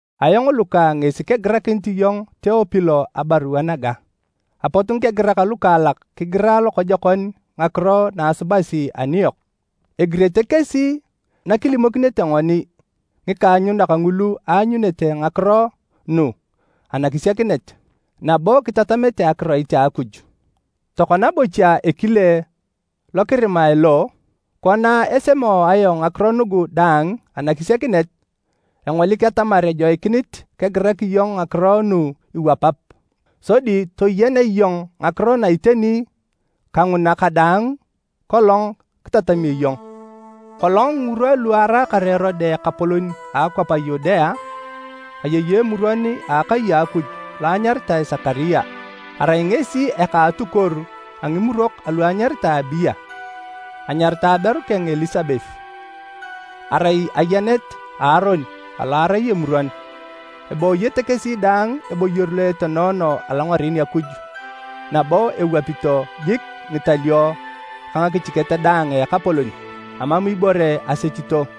Ayong Luka ngesi kegirakinit iyong Teopilo abarua naga: Apot ngikegirak lukaalak kigira lokojokon ngakiro na asubasi aniyok. Egirete kesi nakilimokinete ngoni ngikaanyunak ngulu aanyunete ngakiro nu anakisiakinet, nabo kitatamete akiroit a Akuj. Tokona bocha ekile lo kirimae lo, kona esemo ayong ngakiro nugu daang anakisiakinet, engolik atamar ejoikinit kegirak iyong ngakiro nu iwapap. Sodi toyenea iyong ngakiro na iteni ka nguna kadaang kolong kitatamio iyong. Kolong ngirwa lu araakar Erode ekapolon a akwap a Yudea, ayei emuron a akai a Akuj lo anyaritae Sekaria. Arai ngesi eka a atukuoru a ngimurok alu anyaritae Abia. Anyaritae aberu keng Elisabet, arai ayenet a Aron alo arai emuron. Ebooyete kesi daang eboyor lo atenoono alongaren Akuj, nabo ewapito jik ngitalio ka ngakichiket daang a Ekapolon. Amam ibore asechito.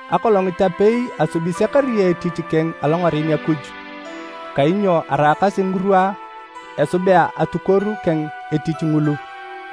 Akolongit apei asubi Sekaria etich keng alongaren Akuj, kainyo araakasi ngirwa esubea atukuoru keng etich ngulu.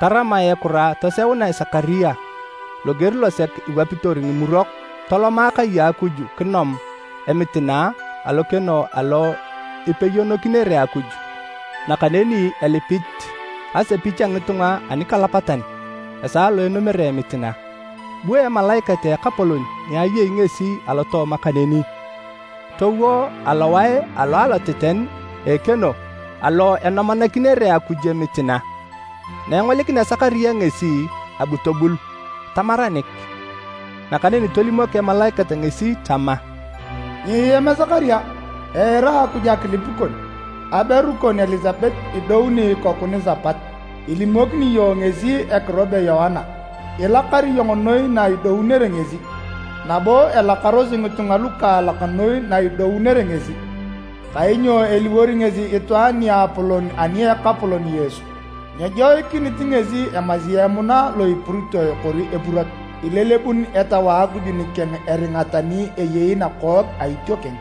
Taramae ekura toseunae Sekaria loger losek iwapito ngimurok, toloma kai a Akuj kinom emitina alokeno alo ipeyonokinere Akuj, nakaneni elipit asepich a ngitunga anikalapatan esaa lo enomere emitina. Bu emalaikat a Ekapolon ni ayei ngesi alotooma kaneni, towo alowae alo aloteten a ekeno alo enomanakinere Akuj emitina. Na engolikinea Sekaria ngesi, abu tobul, tamaranik. Nakaneni tolimok emalaikat ngesi tama, “Nyiem Sekaria! Eira Akuj akilip kon, aberu kon Elisabet idouni ikoku nisapat. Ilimokini iyong ngesi ekiro be Yoana. Ilakar iyong noi na idounere ngesi, nabo elakarosi ngitunga lukaalak noi na idounere ngesi! Kainyo eliwor ngesi itwaan niapolon ani a Ekapolon Yesu. Nyejoikinit ngesi emasi emuna lo epuritoe kori epurot. Ilelebun Etau a Akuj nikeng eringa tani eyei nakook a itiokeng,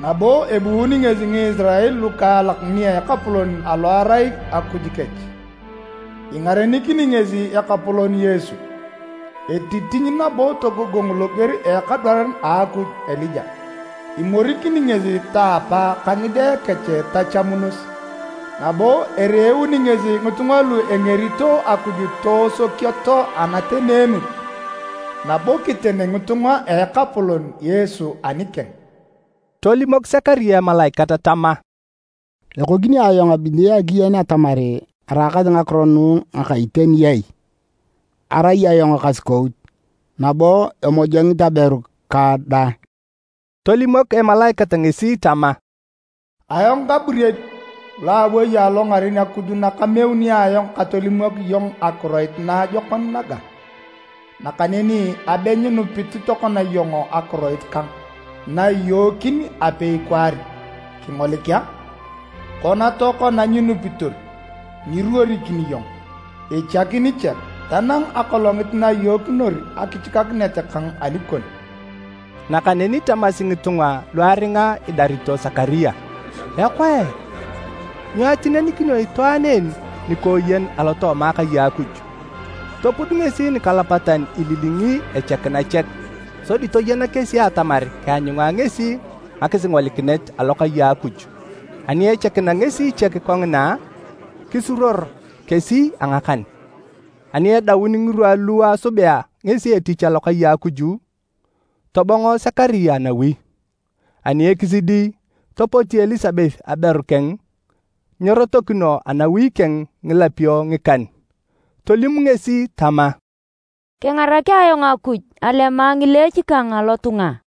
nabo ebuuni ngesi Ngisirael lukaalak nia Ekapolon alo erai Akuj kech. Ingarenikini ngesi Ekapolon Yesu, etitiny nabo togogong loger a ekadwaran a Akuj Elija. Imorikini ngesi taapa ka ngide kech tachamunos, nabo ereeuni ngesi ngitunga lu engerito Akuj toosokioto anateneanut, nabo kiten ngitunga a Ekapolon Yesu anikeng.” Tolimok Sekaria emalaikat tama, “Ekokini ayong abili akiyen atamar eraakasi ngakiro nu ngaka iteni ai? Arai ayong ekasukout nabo emojongit aberu kang dang.” Tolimok emalaikat ngesi tama, “Ayong Gaburiel, lo awei alongaren Akuj na kameuni ayong katolimok iyong akiroit naajokon naga. Nakaneni abe nyinupit tokona iyong akiroit kang, na iyookin apei kwaar. Kingolik a! Kona tokona nyinupitor, nyiruorikini iyong, ichakin chek, tanang akolongit na iyookinor akichikakinet kang anikon.” Nakaneni tamasi ngitunga lu aringa idarito Sekaria, “Ekoe, nyo atinenikinio itwaan en nikooyen alotooma akai a Akuj!” Topud ngesi nikalapatan ililingi echakina chek, sodi toyena kesi atamar keanyunga ngesi ngakisingolikinet alokai a Akuj. Ani echakina ngesi chek kongina, kisuruor kesi a ngakan. Ani edaun ngirwa lu esubea ngesi etich alokai a Akuj, tobongo Sekaria nawi. Ani ekisidi, topoti Elisabet aberu keng, nyerotokino anawi keng ngilapio ngikan. Tolim ngesi tama, “Kengarak ayong Akuj alema ngileech kang alotunga!”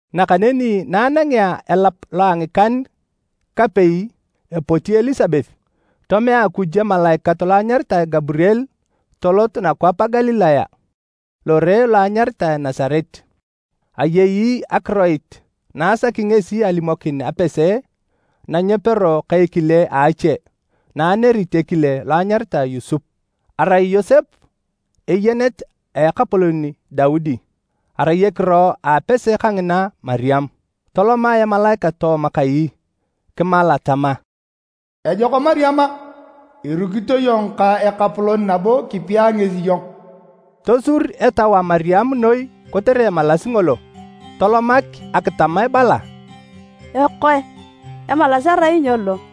Nakaneni na anangea elap lo a ngikan-kapei epoti Elisabet, tomea Akuj emalaikat lo anyaritae Gaburiel tolot nakwap a Galilaya, lore lo anyaritae Nasaret. Ayei akiroit na asaki ngesi alimokin apese na nyepero ka ekile a ache na anerit ekile lo anyaritae Yosep. Arai Yosep eyenet a Ekapolon Daudi. Arai ekiro a apese kangina Mariam. Toloma emalaikat tooma kai, kimala tama, “Ejok Mariam a! Irukito iyong ka Ekapolon nabo kipia ngesi iyong!” Tosur etau a Mariam noi kotere emalas ngolo. Tolomak akitam ebala, “Ekoe, emalas erai nyo lo?”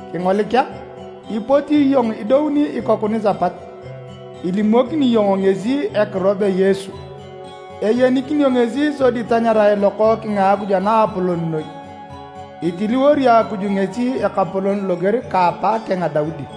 Kingolik a, ipoti iyong kidou ikoku nisapat, ilimokini iyong ngesi ekiro be Yesu. Eyenikinio ngesi sodi tanyarae Lokookeng a Akuj a Naapolon noi. Itiliwori Akuj ngesi Ekapolon loger ka apaakeng Daudi.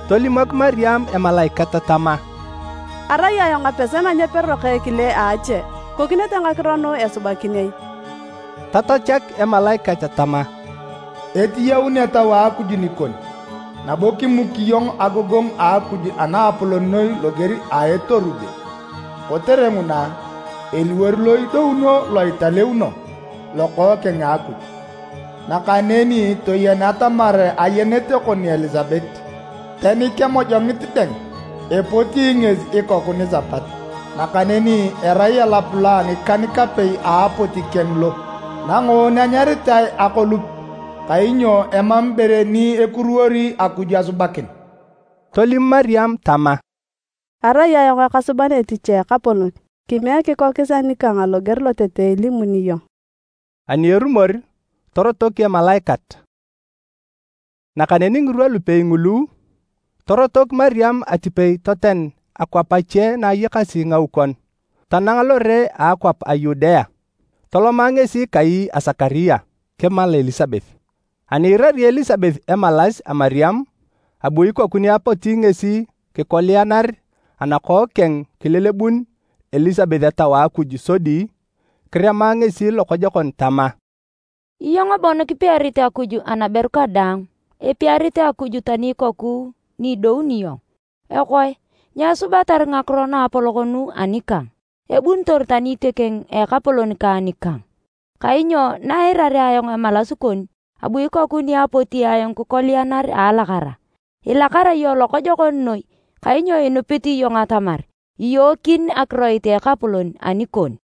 Tolimok Mariam emalaikat tama, “Arai ayong apese na nyepero ka ekile a ache, ikokinete ngakiro nu esubakin ai?” Tatachak emalaikat tama, “Etiyaun Etau a Akuj nikon, nabo kimuki iyong agogongu a Akuj a Naapolon Noi loger a Etorube, kotere nguna, eliwor lo idounio lo italeuno, Lokookeng a Akuj. Nakaneni toyen atamar ayenet kon Elisabet, tani kemojongit dang, epoti ngesi ikoku nisapat, nakaneni erai elap lo a ngikan-kapei a apoti keng lo, nangoon anyaritae akolup. Kainyo emam ibore ni ekuruwori Akuj asubakin.” Tolim Mariam tama, “Arai ayong akasuban etich a Ekapolon, kimiek kikokis anikang loger lotete ilimuni iyong.” Ani erumor, torotok emalaikat. Nakaneni ngirwa lupei ngulu, torotok Mariam atipei toten akwap ache na ayakasi ngaukon, tanang lore a akwap a Yudea. Toloma ngesi kai a Sekaria, kimala Elisabet. Ani iirari Elisabet emalas a Mariam, abu ikoku ni apoti ngesi kikolianar anakook keng kilelebun Elisabet Etau a Akuj sodi kirema ngesi lokojokon tama, “Iyong bon kipiarit Akuj anaberu kadaang! Epiarit Akuj tani ikoku ni idouni iyong! Ekoe nyo esubatar ngakiro naapolok nu anikang, ebunitor tani itiokeng a Ekapolon kang nikang? Kainyo na eirarea ayong emalas kon abu ikoku ni apoti ayong kikolianar a alakara. Ilakara iyong lokojokon noi, kainyo inupit iyong atamar iyookin akiroit a Ekapolon anikon!”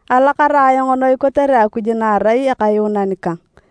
alakara ayong noi kotere Akuj na erai Akayuunan kang,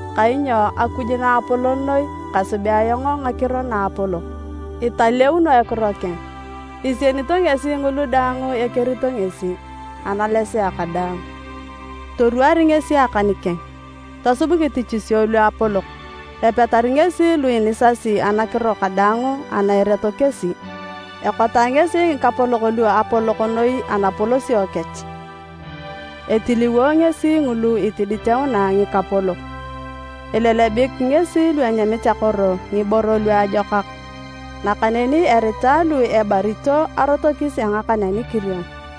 Kainyo Akuj Naapolon Noi, kasubea ayong ngakiro naapolok. Italeuno ekiro keng. Isienito ngesi ngulu daang ekerito ngesi, analesea kadaang. Itorwaari ngesi akan keng, tosub ngitichisio luapolok, epetari ngesi lu inisasi anakiro kadaang a na ereto kesi. Ekota ngesi ngikapolok lu apolok noi anapolosio kech, etiliwo ngesi lu itiditeuna ngikapolok. Elelebik ngesi lu enyamit akoro ngiboro luajokak, nakaneni erita lu ebarito, arotokis a ngakan a nikirion.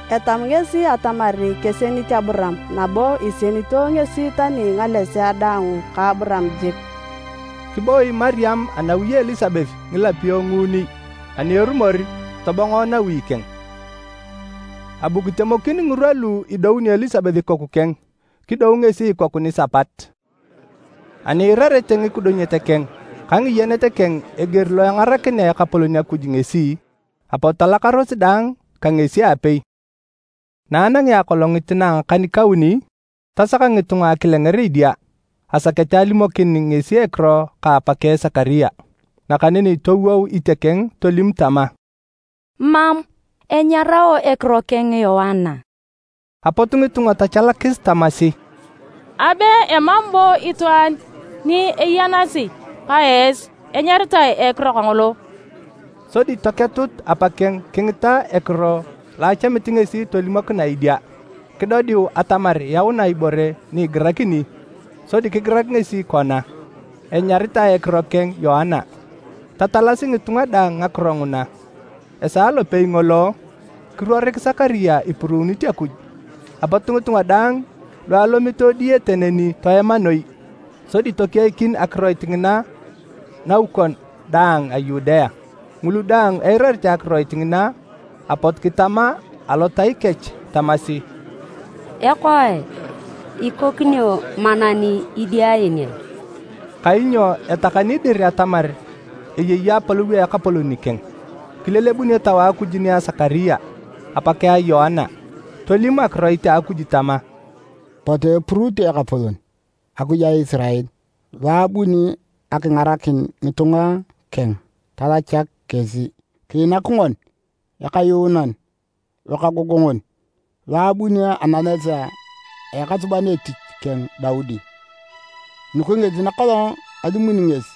Etamu ngesi atamar kesienit Aburaam nabo isienito ngesi tani ngalesea daang ka Aburaam jik!” Kiboi Mariam anawi a Elisabet ngilapio nguuni, ani erumor, tobongo nawi keng. Abu kitemokin ngirwa lu idounio Elisabet ikoku keng, kidou ngesi ikoku nisapat. Ani iirarete ngikidunyet keng ka ngiyenet keng eger lo engarakinea Ekapolon Akuj ngesi, apot talakaros daang ka ngesi aapei. Na anangea akolongit na a ngakan-kauni, tasaka ngitunga akilenger idia. Asakete alimokin ngesi ekiro ka apakeng Sekaria. Nakaneni towou itiokeng tolim tama, “Mam! Enyarao ekiro keng Yoana.” Apot ngitunga tachalakis tamasi, “Abe emam bo itwaan ni iyanasi ka esi enyaritae a ekiro kangolo!” Sodi toketut apakeng kingita ekiro lo achamit ngesi tolimokinae idia. Kidodiu atamar yaunae ibore ni igirakini, sodi kigirak ngesi kona: “Enyaritae ekiro keng Yoana.” Tatalasi ngitunga daang ngakiro nguna. Esaa lopei ngolo, kiruorik Sekaria ipuruunit Akuj. Apot ngitunga daang lu alomito diyete neni toema noi, sodi tokeikin akiroit ngina naukon daang a Yudea. Ngulu daang eirarete akiroit ngina apot kitama alotai kech tamasi, “Ekoe, ikokini monan idia en ai?” Kainyo etakani dir atamar eyei apolou a Ekapolon nikeng. Kilelebun Etau a Akuj nia Sekaria, apakeng a Yoana, tolim akiroit a Akuj tama: “Potu epuruutu Ekapolon, Akuj a Isirael! Lo abuni akingarakin ngitunga keng talachak kesi. Kiinak ngoni Ekayuunan Lokaagongon, lo ebuni anales a ekasuban etich keng Daudi. Nugu kesi nakolong alimuni ngesi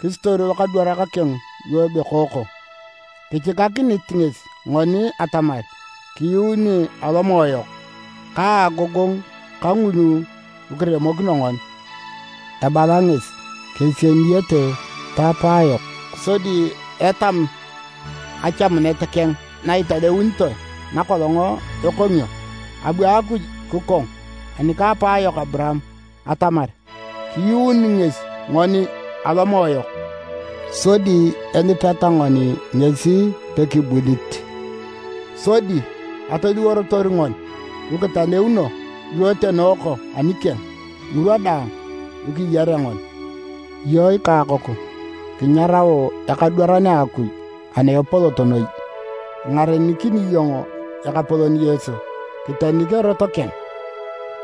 kisitoru lokadwarak keng lu ebekooko. Kichikakinit ngesi ngoni atamar kiyuuni alomoe yok, ka agogongu ka ngulu kiremokino ngoni. Ebala ngesi kesieniyete taapayok, sodi etam achamunet keng na italeunitoe nakolong ekongio. Abu Akuj kikong ani ka apaayok Aburaam atamar, kiyuuni ngesi ngoni alomoe yok, sodi elipeta ngoni ngesi pekibulit. Sodi atoliworotor ngoni lukitaleuno, lu kitenooko anikeng, ngirwa daang lu kiyarea ngoni. Iyong ikakoku, kinyarao ekadwaran a Akuj ana Epolot Noi, ingarenikini iyong Ekapolon Yesu, kitenik erot keng,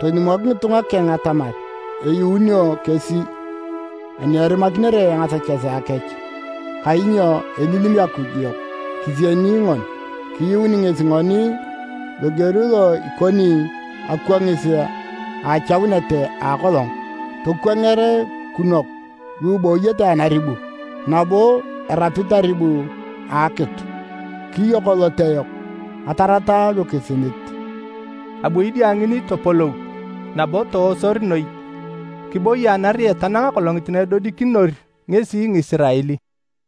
tolimok ngitunga keng atamar eyuunio kesi ani erimakinere ngasechesea kech. Kainyo elilim Akuj yok kisieni ngoni. Kiyuuni ngesi ngoni a eger alo ikoni akwangis a achaunet a akolong. Tokwanger kinwaku lu ibooyete anaribu, nabo lu erapit aribu a akitu. Kiyok elote yok, atarata lukisilit.” Abu idia ngini topolou, nabo toosor noi. Kiboi anariet tanang akolongit na edodikinor ngesi Ngisirael.